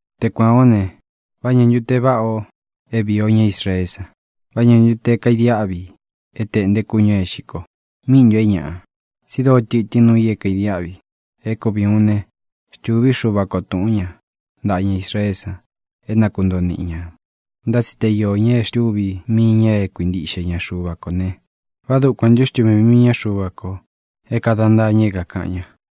Te kuān ó ne, ¿vá ñā ntu te váꞌa ō é vīi o ñá Israeé san? ¿Vá ñā ntu te kaidiáꞌvi é tēꞌnté kúñū é īxi ko? ¿Míꞌi ntū é ñaꞌa? Tsi dóo tɨtɨ́n nuu i é kaidiáꞌvi. É kuvi ūun ne: xtūví Xuva ko tūꞌún ña ntaꞌa ña Israeé san é na kuntoo niꞌi ñā. Ntá tsi te iō ña é xtuvī mii ña é kakuintiꞌxe ña Xuva kō ne, ¿vá dukuan ntū é xtuvī mii Xuva ko é kāda ntaa ña é kākaꞌan ña?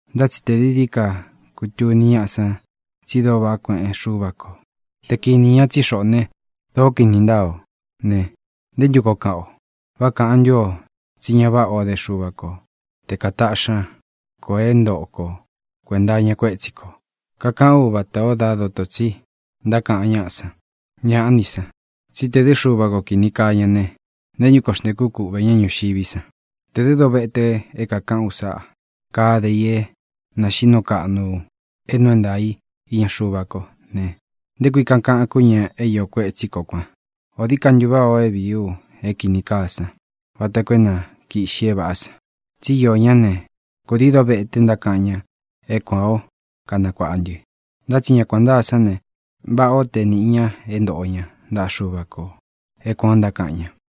Ntá tsi tē dií dií ka kutuni ñáꞌa san tsi dóo vaꞌá kueꞌen Xúva ko te kinī ña tsí xoꞌō né, dōó kini ntáa ō ne, ¿nté ntu koo kaꞌan o? ¿Vá kāꞌan ntú o tsí ña váꞌā ó de Xuva ko te kataꞌxi ña kō é ntoꞌo ko kuēnta iña kuétsi kō? (Kakaꞌán u vatā o dá doto tsī ntákaꞌan ñáꞌa san.) ¡Ñāꞌá ni san! tsí tē dɨ́ Xuva ko kini kaa ña ne, ¿nté ntu koo xntēkú kuꞌvē ñá ñuxiví san? Tē dɨ́ dovete é kākaꞌán u sa kade i é nāxiꞌí nuu kaꞌnu é nuu é ntaā i iña Xuva kó ne, ¿nté kui kakaꞌan kú ña é iō kuetsí ko kuan? ¿Ō dií ka ntu váꞌā o é vīí u é kīni kaa san vata koo é na kīꞌxi é vāꞌá san? Tsí iō ñá ne, kudii dovete ntákaꞌan ña é kuān ó kanakuāꞌa ntɨ. Ntá tsi ña kuān ntáa sán ne, váꞌā ó te nīꞌi ña é ntoꞌo ña ntaꞌa Xuva kō é kuān ó ntákaꞌan ña.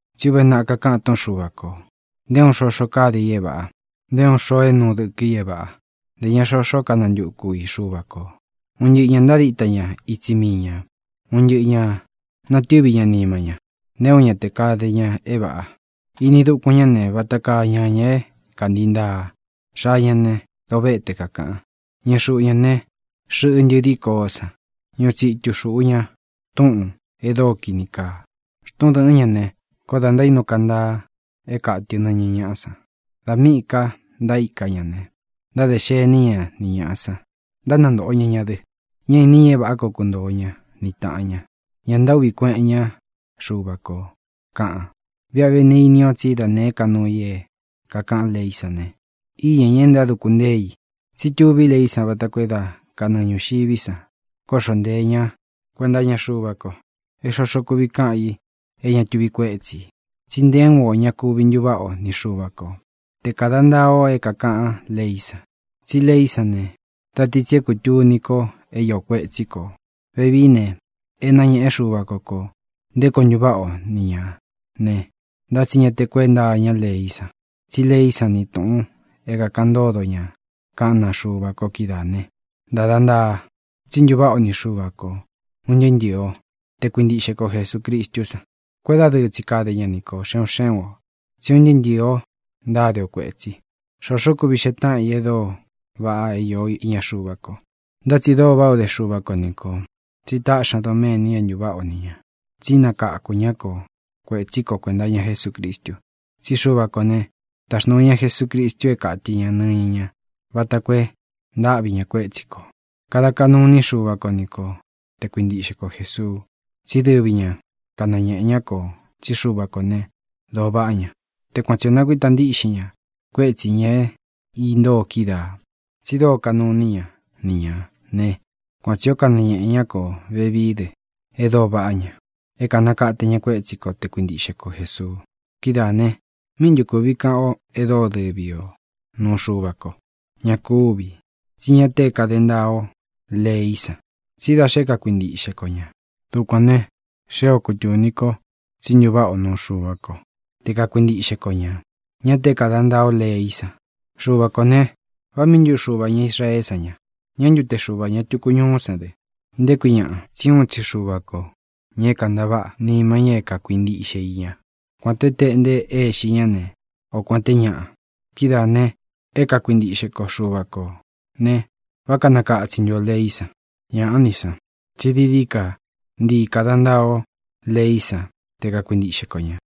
Tsí uve naꞌa kakaꞌan túꞌun Xuva kō: ¡Nté uun xoxo káde i é vāꞌa! Nté uun xoo é nuu dɨkɨ i é vāꞌa. Ntē ña xoxó kanantuku i Xuva kō. Un ntɨꞌɨ ñā ntádita ña itsi mii ñā. Un ntɨꞌɨ ñā natɨ́vi ña nima ña. ¡Nté uun ña tē kade ña é vāꞌa! Ini dukun ñá ne, vata kaa ñañā é kāntii ntaa. Xaa ña ne, dovéte kakāꞌan. Ñɨɨ xuꞌu ñā ne, xɨꞌɨ ntɨdí koó san. Ñuꞌu tsitu xūꞌu ña túꞌūn e dóo kini kaa. Xtun dɨ̄ꞌɨ́n ña ne, koó dā ntaínu kantaa é kātɨ nɨñɨ ñaꞌá san. Dā míꞌī ka ntaíka ña ne, ntádē xení ña ni ñāꞌa san, ntánantōꞌo ña ña dɨ. Ñá īni ña é vāꞌá koo kuntoo ña ni tāꞌan ña. Ña ntaúꞌvī kueꞌen ñá Xuva kō, kaꞌan. Viꞌa vé ne, ini o tsí da nēé ka nuu i é kākaꞌán leí san ne, íña ñā e ntáduku ntée i. Tsí tuví leí san vata koo é da kanɨɨ ñūxiví san kóꞌxo nteē ñá kuenta iña Xuva ko, é xoxo kuvi káꞌan ī é ña tuvi kuétsi ī. Tsi nté uun ō ña kuvi ntuváꞌa o ni Xuva ko te kāda ntaa o é kākaꞌán leí san. Tsí leí san ne, da ti tsi é kūtuni ko é iō kuetsí kō. Vevií ne, é nañéꞌe Xuva ko kō nté koo ntuváꞌa o ni ñā ne, ntá tsi ña te kuénta iñá leí san. Tsí leí san ni tūꞌun é kāꞌan ntódo ña kaꞌán naa Xuva ko kídaā ne, ntada ntaa tsí ntuváꞌa o ni Xuva kō, un ntɨɨ́ ntɨɨ o, te kuintiꞌxe ko Jesūcristú san. Kuédadɨɨ tsi kade ña ni kō, xe un xé un ō, tsí un ntɨɨ́ ntɨ̄ɨ o ntáde o kuētsi. Xoxó kuvi xee táꞌan i e dóo vaꞌa é īó iña Xuva ko. Ntá tsi dóo váꞌā o dé Xuva ko ni kō, tsi táꞌxi ña doméni é ntuváꞌa o ni ñā. Tsí nakáku ña ko kuētsí ko kuēnta iña Jesúcristu. Tsí Xuva kō né, taxnūu ña Jesucristu é kātɨ ña nɨñɨ ñá vata koo e ntáꞌvi ñā kuétsi kō. Kade kaꞌnu iní Xuva ko ni ko te kuintiꞌxe ko Jēsuu. Tsí dɨvi ña kanañēꞌe ñá kō tsí Xuva kō né, dōo vaꞌá ña. Te kuan tsi ō nakuíta ntiꞌxin ña kuétsī ña é intóo kídaā Tsi dóo kaꞌnu iní ña ni ñā né, kuan tsī ó kanañēꞌe ñá kō vevií dɨ e dóo vaꞌá ña é kānakate ña kuétsi ko te kakuintiꞌxe ko Jēsuu. Kidáā ne, ¿míꞌi ntu kuvi kaꞌan o e dóo dɨvi o nūu Xuva ko? Ña kúvī. Tsí ña te é kāde ntaa o leí san, tsí da xe é kakuintiꞌxe ko ñā. Dukuān ne, xée ō kútuni ko tsí ntuváꞌa o nuu Xuva ko te kakuintiꞌxe ko ñā, ñá tē é kāda ntaa o leí san. Xuva kō ne, ¿vá mii ntu Xuvā ña Israeé san ña? ¿Ña ntu te Xuvā ña tuku ñuú san dɨ? ¿Nté kui ñaꞌa? Tsí uun tsi Xuva kō, ña é kantaváꞌa nima ña é kakuintiꞌxe i ña, kuān te téꞌnte é ixi ñá ne, o kuān té ñaꞌa. Kidáā ne, é kakuintiꞌxe ko Xuva kō ne, ¿vá kanakatsin ntu ō leí san? ¡Ñāꞌá ni san! tsí dií dií ka ntii kāda ntaa o leí san te kakuintiꞌxe ko ñā.